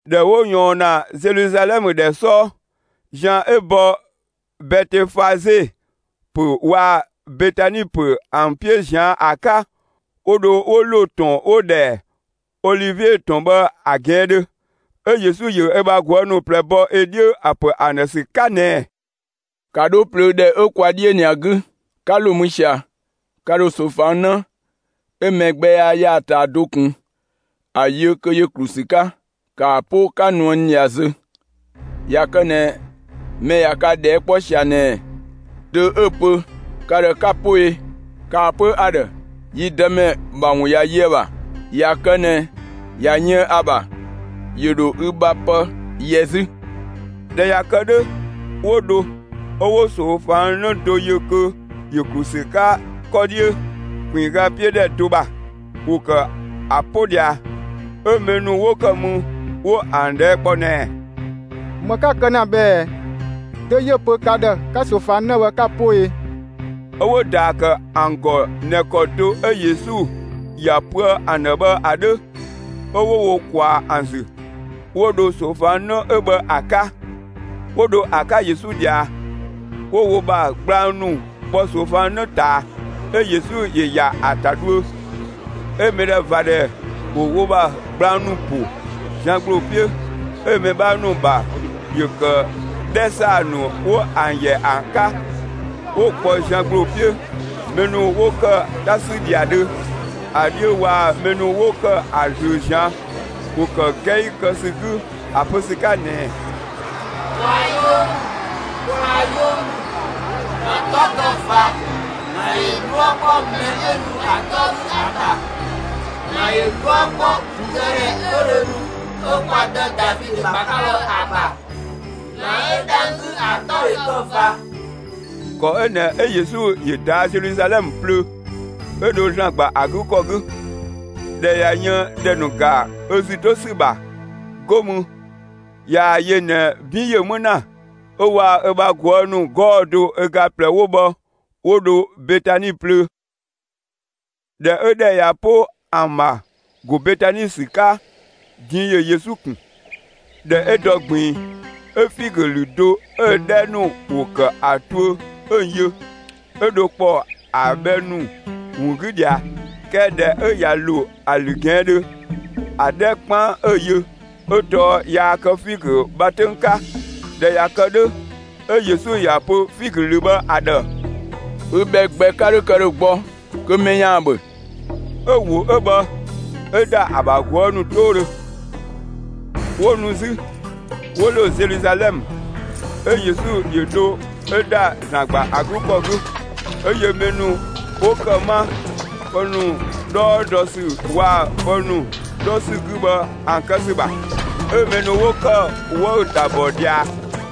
꞊Dhɛ 'wo ꞊yɔɔn ‑na Zeluzalɛmë ‑dhɛ 'sɔɔ, zian 'ö bɔ Bɛtefaze ‑pö waa‑ Betani ‑pö ‑an 'piö ꞊zian' ‑a 'ka, 'wo dho 'wo ‑lo ‑tɔn 'wo‑ ‑dhɛ Olivie ‑tɔn bhë ‑a ꞊gɛɛndhö. 'Ö Yesu ‑yö ö bha ꞊guë' ‑nu ꞊plɛ bɔ ö 'dhiö ‑a ‑pö ‑an ‑dhë ‑sü 'ka ꞊nɛɛ: «‑Ka 'dho plöö ‑dhɛ 'ö kwa 'dhiö ꞊nɛ ‑a 'gü! 'Ka ‑lo mü ꞊sia, ka ‑dho ꞊soofang 'në 'ö mɛ gbɛ yaa ‑ya ‑a ꞊taa do ꞊kun, ‑a yö kö ‑yö ‑klu ‑sü 'ka. ‑Ka ‑a 'po 'ka nuë n ꞊dhia zö! ꞊Ya kë ꞊nɛ, mɛ ꞊ya ka ꞊dhɛɛ' 'kpɔ ꞊sia ꞊nɛɛ: ‹Dö 'ö‑ pö ka ‑dhë 'ka‑ 'po e?›, ‑kaa pö ‑a ‑dhë: ‹Yi Dëmɛ ‑bha ‑wun ꞊ya yö ‑a ‑bha›. ꞊Ya kë ꞊nɛ ꞊ya yën ‑a ‑bha, ‑yö ‑dho ü ‑bha pë yɛ 'zü.» ꞊Dhɛ ꞊ya kë 'dhö, 'wo dho; 'ö 'wo ꞊soofang 'në do yö kö ‑yö ‑klu ‑sü 'ka 'kɔ 'dhiö, ‑kpinngga 'piö ‑dhɛ do ‑bha, ‑wo ‑kë ‑a 'po ꞊dhia, 'ö mɛ ‑nu 'wo ‑kë mü, 'wo ‑an ꞊dhɛɛ' kpɔ ꞊nɛɛ: «‑Më 'ka‑ kë ‑na bhë ꞊ɛ? Dö 'yö‑ pö ka ‑dhë 'ka ꞊soofang 'në bhë, 'ka‑ 'po e?» 'Ö 'wo‑ ‑daa ‑kë ‑an ‑gɔ ꞊nɛ ‑kɔ ‑de 'ö Yesu ‑ya pöë ‑an ‑dhë bhë ‑a 'dhö. 'Ö 'wo wo ꞊kwaa ‑an ‑zü, 'wo dho ꞊soofang 'në 'ö bhë ‑a 'ka. 'Wo dho ‑a 'ka Yesu ꞊dhia, 'wo wo ‑bha gblang ‑nu kpɔ ꞊soofang 'në ꞊taa, 'ö Yesu ‑yö ‑ya ‑a ‑ta dhuö. 'Ö mɛdhɛvadhɛ ‑wo wo ‑bha gblang ‑nu ‑po zian ‑gbloo 'piö. 'ö mɛ 'bhaa ‑nu ‑bha ‑yö ‑kë 'dhɛ ‑saa ‑nu 'wo ‑an ‑yɛ ‑an 'ka, 'wo‑ kpɔ zian ‑gbloo 'piö. Mɛ ‑nu 'wo ‑kë 'ta 'sü ‑dhiadhö ‑a 'dhiö waa‑ mɛ ‑nu 'wo ‑kë ‑a ꞊zlöö ꞊zian', ‑wo ‑kë 'gɛi kë ‑sü 'gü ‑a pö ‑sü 'ka ꞊nɛɛ: «Kwaa‑ 'yoo ‑mü! Kwaa‑ 'yoo ‑mü! ‑Zlan 'tɔ kë ꞊va! ‑Zlan ‑yö 'dhuë‑ 'kpɔ mɛ 'ö nu ‑a 'tɔ 'gü ‑a ‑bha! ‑Zlan ‑yö 'dhuë‑ 'kpɔ ‑gludëdhɛ 'ö dho nu 'ö kwa dë Davidö ‑bha 'ka bhë ‑a ‑bha, ‑Zlan 'ö dhang‑ 'gü, ‑a 'tɔ ‑yö kë ꞊va!» ‑Kɔ 'ö ꞊nɛ 'ö Yesu ‑yö ꞊daa' Zeluzalɛmë plöö, 'ö dho ‑Zlan ‑gba ‑a 'gü ‑kɔ 'gü. ꞊Dhɛ ꞊ya yën ‑dhɛ ‑nu ‑ga ö ‑zü 'to ‑sü ‑bha, 'go mü, ꞊yaa‑ yö ꞊nɛ 'bin ‑yö 'më ‑na, 'ö waa‑ ö bha ꞊guë' ‑nu 'gɔɔ‑ do ö ga ꞊plɛ 'wo bhë 'wo dho Betani plöö. ꞊Dhɛ 'ö ‑dhɛ ꞊ya 'po ‑an ‑bha ‑go Betani ‑sü 'ka, din ‑yö Yesu ꞊kun. ꞊Dhɛ 'ö dɔ ꞊gbiin, 'ö figö ‑lü do 'ö‑ 'dhɛ ‑nu ‑wo ‑kë ‑a tuö, 'ö‑ yö, 'ö dho ‑kpɔɔ ‑a bhɛ ‑nu ‑wun 'gü ꞊dhia. 'Kɛɛ ‑dhɛ 'ö ꞊ya ‑lo ‑a ‑lü ꞊gɛɛndhö, ‑a 'dhɛ 'kpaan 'ö‑ yö, 'ö tɔɔ yaa kë figö bha 'töng 'ka. ꞊Dhɛ ꞊ya kë 'dhö, 'ö Yesu ‑ya pö figö ‑lü bhë ‑a ‑dhë: «Ü bhɛ gbɛ 'ka 'dho kë ‑dhö gbɔ kö mɛ ‑yaan ‑bhö!» 'Ö‑ ‑wo 'ö bhë, 'ö ‑da ‑a ‑bha ꞊guë' ‑nu 'toodhö. 'Wo nu 'zü, 'wo ‑lo Zeluzalɛmë. 'Ö Yesu ‑yö dho 'ö ‑da ‑Zlan ‑gba ‑a 'gü ‑kɔ 'gü, 'ö yö mɛ ‑nu 'wo ‑kë 'ma, pë ‑nu 'dhɔɔ dɔ ‑sü waa‑ pë ‑nu 'dhɔ ‑sü 'gü bhë ‑an kë ‑sü ‑bha. 'Ö mɛ ‑nu 'wo ‑kë 'wëü‑ ‑ta ‑bɔ ꞊dhia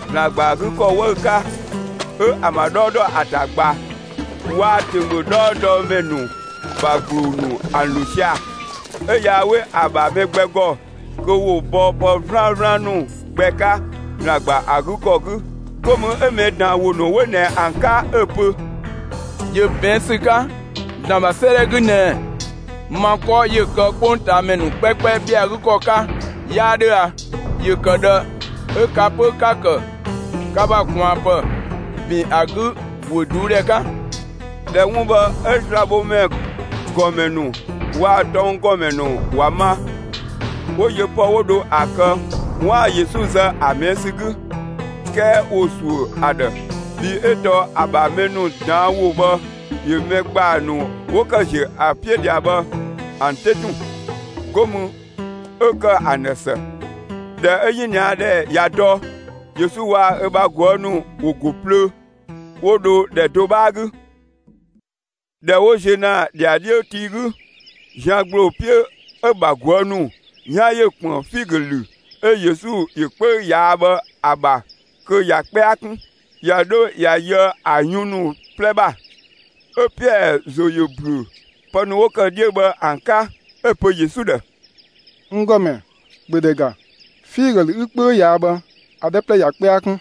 ‑Zlan ‑gba ‑a 'gü ‑kɔ 'wëü‑ 'ka 'ö ‑an ‑bha 'dhɔɔ dɔ ‑a ‑ta ꞊gba waa‑ ‑tönggö 'dhɔɔdɔmɛ ‑nu ‑bha ‑gbloo ‑nu ‑an ‑lo sia‑. 'Ö yaa 'we ‑a ‑bha mɛ gbɛ ‑gɔ, kö ‑wo bɔ pë 'vlaan 'vlaan ‑nu gbɛ 'ka, ‑Zlan ‑gba ‑a 'gü ‑kɔ 'gü. 'Go mü 'ö mɛ ꞊daan' ‑wo ‑nu 'wo ꞊nɛ ‑an 'ka 'ö‑ pö: «‑Yö ꞊bɛɛn' ‑sü 'ka ‑Zlan ‑bha 'sëëdhɛ 'gü ꞊nɛɛ: 'Ma 'kɔ 'yö kë 'kpongtaamɛ ‑nu 'kpɛkpɛ ‑bhɛa ‑a 'gü ‑kɔ 'ka, 'yaa 'dhö a? ‑Yö ‑kë ꞊dhë 'ö ka 'pö 'ka‑ kë ka ‑bha ꞊kwaanpë ‑bin ‑a 'gü ‑guö ꞊duudhɛ 'ka!» ꞊Dhɛ 'wun bhë 'ö slabhomɛ ‑gɔmɛ ‑nu waa‑ tɔnggɔmɛ ‑nu ‑wa ma, 'wo yö pë 'wo dho ‑a kë 'waan‑ Yesu zë ‑a ꞊mɛɛ' ‑sü 'gü. 'Kɛɛ ‑wo ‑suö ‑a ‑dhë, bhii 'ö tɔɔ ‑a ‑bha mɛ ‑nu ꞊daan' ‑wo bhë ‑yö mɛ ‑gbaa ‑nu 'wo ‑kë ‑ziö ‑a 'piö ꞊dhia bhë ‑an 'te tun, 'go mü, 'ö ‑kë ‑an ‑dhë ‑së. ꞊Dhɛ 'ö 'yiniadhɛ ꞊ya dɔ, Yesu waa‑ ö bha ꞊guë' ‑nu ‑wo ‑go plöö, 'wo dho ‑dhɛ do 'bhaa 'gü. ꞊Dhɛ 'wo ziö ‑na ‑dhiadhiö tii 'gü, zian ‑gbloo 'piö, 'ö‑ ‑bha ꞊guë' ‑nu 'yan ‑yö ‑kpën figö ‑lü 'ö Yesu ‑yö 'kpöü ꞊yaa' bhë ‑a ‑bha kö ꞊ya 'kpɛa 'kun, ꞊ya 'dho ꞊ya yöë ö yun ‑nu 'plɛ ‑bha. 'Ö Piɛɛ ‑zo ‑yö ‑büö pë ‑nu 'wo ‑kë 'dhiö bhë ‑an 'ka, 'ö‑ pö Yesu ‑dhë: «N ‑Gɔmɛ, ‑bhö ‑dhɛ ‑ga, figö ‑lü 'ü 'kpöü ꞊yaa' bhë, ‑a ‑dhɛ 'plɛ ꞊ya 'kpɛa 'kun!»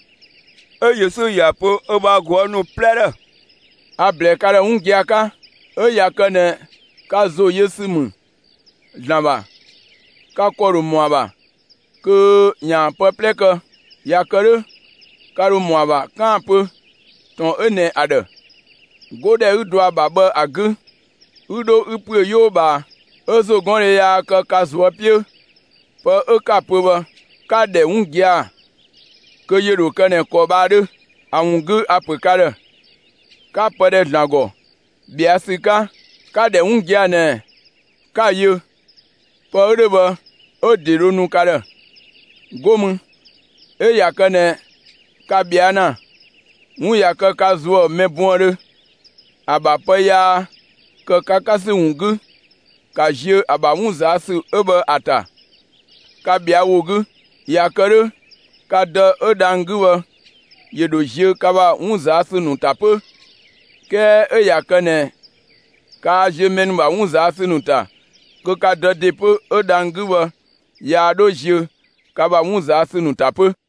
'Ö Yesu ‑ya pö ö bha ꞊guë' ‑nu 'plɛ ‑dhë: «A‑ ‑blɛɛ ka ‑dhë 'wun gia‑ 'ka: 'Ö ꞊ya kë ꞊nɛ ka ‑zo yö ‑sü ‑mü ‑Zlan ‑bha, ka ‑kɔ ‑dho ‑mɔ ‑a ‑bha kö ‑yaan pë 'plɛ kë. ꞊Ya kë 'dhö, ka ‑dho ‑mɔ ‑a ‑bha 'kaan‑ pö ‑tɔn 'ö ꞊nɛ ‑a ‑dhë: ‹'Godhɛ 'ü dɔ ‑a ‑bha bhë ‑a 'gü, 'ü 'dho 'ü ‑püö 'yoo ꞊bhaa!› 'Ö ‑zogɔndhe yaa kë ka ꞊zuö' 'piö, pë 'ö 'ka‑ pö bhë, 'ka‑ ‑dhɛ 'wun gia‑, kö ‑yö ‑dho kë ꞊nɛ ‑kɔ bhë ‑a 'dhö. ‑A ‑wun 'gü a‑ ‑pö ka ‑dhë: 'Ka pë ‑dhɛ ‑Zlan ‑gɔ ꞊bhɛa' ‑sü 'ka, 'ka‑ ‑dhɛ 'wun gia‑ ꞊nɛ 'ka‑ yö; pë 'ö 'dhö bhë 'ö‑ ‑de dho nu ka ‑dhë. 'Go mü 'ö ꞊ya kë ꞊nɛ ka ꞊bhɛa' ‑na, 'wun ꞊ya kë ka ‑zuë mɛ buëndhö, ‑a ‑bha pë yaa ‑kë ka 'ka ‑sü ‑wun 'gü, ‑ka ziö ‑a ‑bha 'wun ꞊zaa' ‑sü 'ö bhë ‑a ‑ta, ka ꞊bhɛa' ‑wo 'gü! ꞊Ya kë 'dhö, ka Dë 'ö dhang‑ 'gü bhë ‑yö ‑dho ziö ka ‑bha 'wun ꞊zaa' ‑sü ‑nu ‑ta 'pö. ['Kɛɛ 'ö ꞊ya kë ꞊nɛ, kaa ziö mɛ ‑nu ‑bha 'wun ꞊zaa' ‑sü ‑nu ‑ta, kö ka Dë ‑de 'pö 'ö dhang‑ 'gü bhë, yaa 'dho ziö ka ‑bha 'wun ꞊zaa' ‑sü ‑nu ‑ta 'pö.]»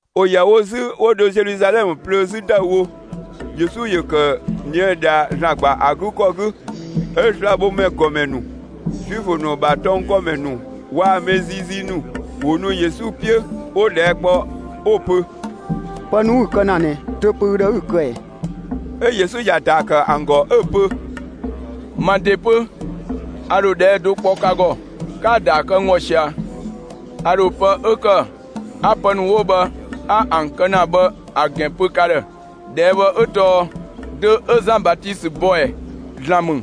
‑Wo ‑yɛ wo 'zü 'wo dho Zeluzalɛmë plöö 'zü ‑dëüwo. Yesu ‑yö ‑kë ꞊nië' ꞊dhia ‑Zlan ‑gba ‑a 'gü ‑kɔ 'gü, 'ö slabhomɛ ‑gɔmɛ ‑nu, Zuifö ‑nu ‑bha tɔnggɔmɛ ‑nu waa‑ mɛ ziizii ‑nu ‑wo ‑nu Yesu 'piö, 'wo‑ ꞊dhɛɛ' kpɔ, 'wo‑ pö: «Pë ‑nu 'ü‑ kë ‑na ꞊nɛ, dö‑ pö ü ‑dhë 'ü‑ kë ꞊ɛɛ?» 'Ö Yesu ‑ya ‑daa ‑kë ‑an ‑gɔ 'ö‑ pö: «Ma ‑de 'pö, a ‑dho ꞊dhɛɛ' do kpɔ ka ‑gɔ. 'Ka‑ ‑daa kë n ‑gɔ ꞊sia, a ‑dho pë 'ö ‑kë 'a pë ‑nu 'wo bhë 'a ‑an kë ‑na bhë ‑a ‑gɛn pö ka ‑dhë. ꞊Dhɛɛ' bhë 'ö tɔɔ: Dö 'ö Zan Batisö bɔ ꞊ɛ? ‑Zlan ‑mü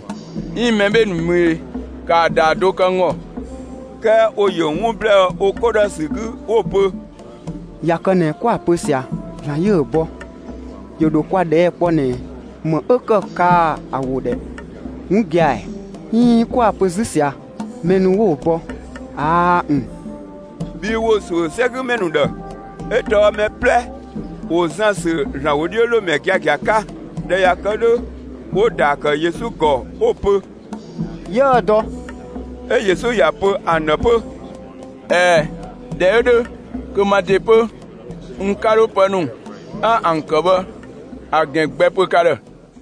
'iin mɛ 'bhee‑ ‑nu ‑mü e? ‑Kaa ‑daa do kë n ‑gɔ!» 'Kɛɛ ‑wo ‑yö 'wun ‑blɛɛ wo 'ko ‑dhë ‑sü 'gü 'wo‑ pö: «꞊Ya kë ꞊nɛ 'kwa‑ pö ꞊sia, ‑Zlan 'yö‑ bɔ, ‑yö ‑dho kwa ꞊dhɛɛ kpɔ ꞊nɛ, ‑më 'ö ‑kë kaa‑ ‑wo ‑dhɛ 'wun gia‑ ‑ɛ? 'Iin 'kwa‑ pö 'zü ꞊sia, mɛ ‑nu ꞊nɛ 'wo‑ bɔ, ꞊aa' ‑n!...» (Bhii ‑wo ‑suö 'sɛgümɛ ‑nu ‑dhë, 'ö tɔɔ mɛ 'plɛ ‑wo Zan ‑sü ‑Zlan ‑wodhiölomɛ giagia 'ka.) ꞊Dhɛ ꞊ya kë 'dhö, 'wo‑ ‑daa ‑kë Yesu ‑gɔ 'wo‑ pö: «'Yiëë‑ dɔ.» 'Ö Yesu ‑ya pö ‑an ‑dhë 'pö: «꞊Ɛɛ, ꞊dhɛ 'ö 'dhö, kö ma ‑de 'pö, n 'ka 'dho pë ‑nu 'a ‑an kë bhë ‑a ‑gɛn gbɛ pö ka ‑dhë.»